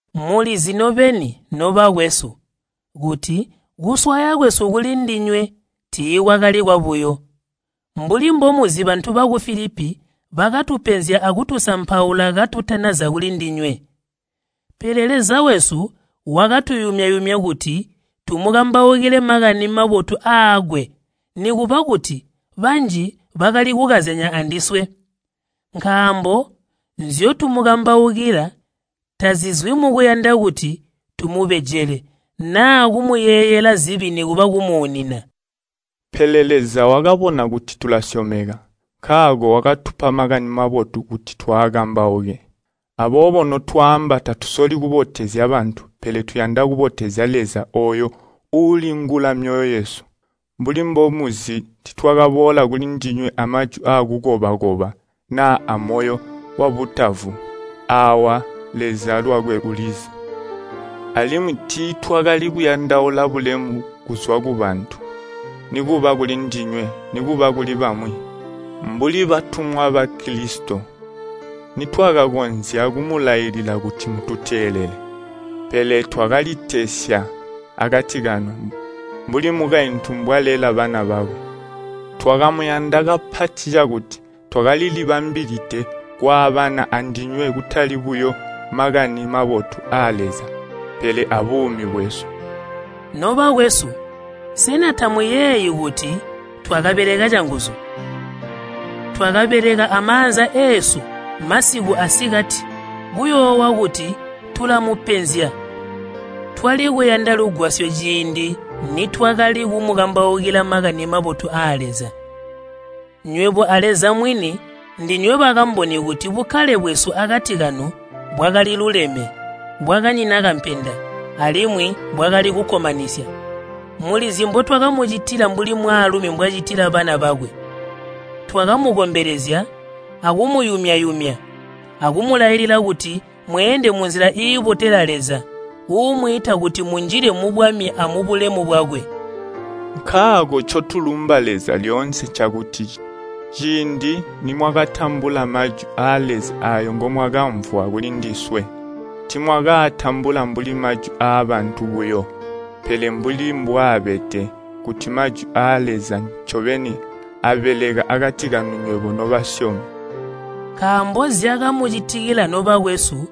Mulizi nobeni, nobakwesu, kuti kuswaya kwesu kulindinywe tiikwakali kwabuyo. Mbuli mbomuzi bantu baku Filipi bakatupenzya akutusampaula katutanaza kulindinywe. Pele Leza wesu wakatuyumya-yumya kuti tumukambaukile Makani Mabotu aakwe nikuba kuti banji bakali kukazyanya andiswe. Nkaambo nzyotumukambaukila tazizwi mukuyanda kuti tumubejele naa kumuyeeyela zibi nikuba kumuunina. Pele Leza wakabona kuti tulasyomeka, nkaako wakatupa Makani Mabotu kuti twaakambauke. Aboobo notwaamba tatusoli kubotezya bantu pele tuyanda kubotezya Leza ooyo uulingula myoyo yesu. Mbuli mbomuzi tiitwakaboola kulindinywe amajwi akukoba-koba naa amoyo wabutavu. Aawa Leza lwakwe ulizi. Alimwi tiitwakali kuyandaula bulemu buzwa kubantu, nikuba kulindinywe nikuba kuli bamwi. Mbuli batumwa ba Kilisito nitwakakonzya kumulailila kuti mututeelele. Pele twakalitesya akati kanu, mbuli mukaintu mbwalela bana bakwe. Twakamuyanda kapati cakuti twakalilibambilide kwaabana andinywe kutali buyo Makani Mabotu aa Leza, pele abuumi bwesu. Nobakwesu, sena tamuyeeyi kuti twakabeleka canguzu? Twakabeleka amaanza eesu masiku asikati kuyoowa kuti tulamupenzya twali kuyanda lugwasyo ciindi nitwakali kumukambaukila Makani Mabotu aa Leza. Nywebo a Leza mwini ndinywe bakamboni kuti bukkale bwesu akati kanu bwakaliluleme, bwakanyina kampenda, alimwi bwakali kukkomanisya. Mulizi mbotwakamucitila mbuli mwaalumi mbwacitila bana bakwe. Twakamukombelezya, akumuyumya-yumya, akumulailila kuti mweende munzila iibotela Leza, uumwiita kuti munjile mubwami amubulemu bwakwe. Nkaako ncotulumba Leza lyoonse ncakuti ciindi nimwakatambula Majwi aa Leza aayo ngomwakamvwa kulindiswe, tiimwakaatambula mbuli majwi aabantu buyo, pele mbuli mbwaabede kuti Mmajwi aa Leza ncobeni aabeleka akati kanu nywebo nobasyomi. Nkaambo zyakamucitikila nobakwesu,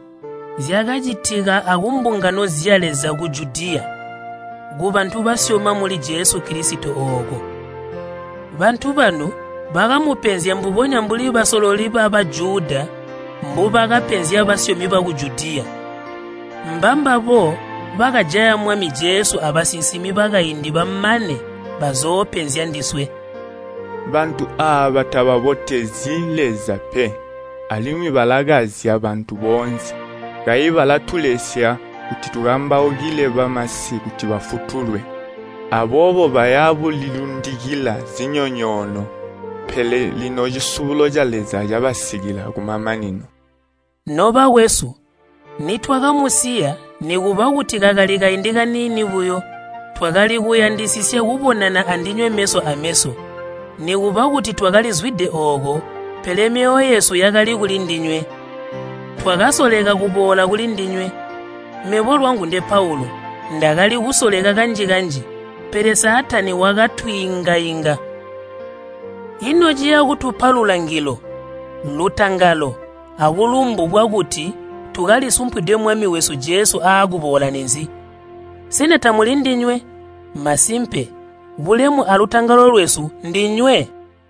zyakacitika akumbungano zya Leza ku Judiya, kubantu basyoma muli Jesu Kilisito ooko. Bantu banu bakamupenzya mbubonya mbuli basololi ba Bajuda mbubakapenzya basyomi baku Judiya. Mbambabo bakajaya Mwami Jesu abasinsimi bakaindi bamane bazoopenzya ndiswe. Bantu aaba tababotezyi Leza pe, alimwi balakazya bantu boonse. Kayi balatulesya kuti tukambaukile bamasi kuti bafutulwe. Aboobo baya bulilundikila zinyonyoono, pele lino cisubulo ca Leza cabasikila kumamanino. Nobakwesu, nitwakamusiya nikuba kuti kakali kaindi kaniini buyo, twakali kuyandisisya kubonana andinywe meso ameso. Nikuba kuti twakalizwide ooko, pele myoyo yesu yakali kulindinywe. Twakasoleka kuboola kulindinywe. Mebo, lwangu nde Paulu, ndakali kusoleka kanji-kanji, pele Saatani wakatwiinga-inga. Ino ciya kutupa lulangilo, lutangalo, abulumbu bwakuti tukalisumpwide Mwami wesu Jesu aakuboola ninzi? Sena tamuli ndinywe? Masimpe, bulemu alutangalo lwesu ndinywe!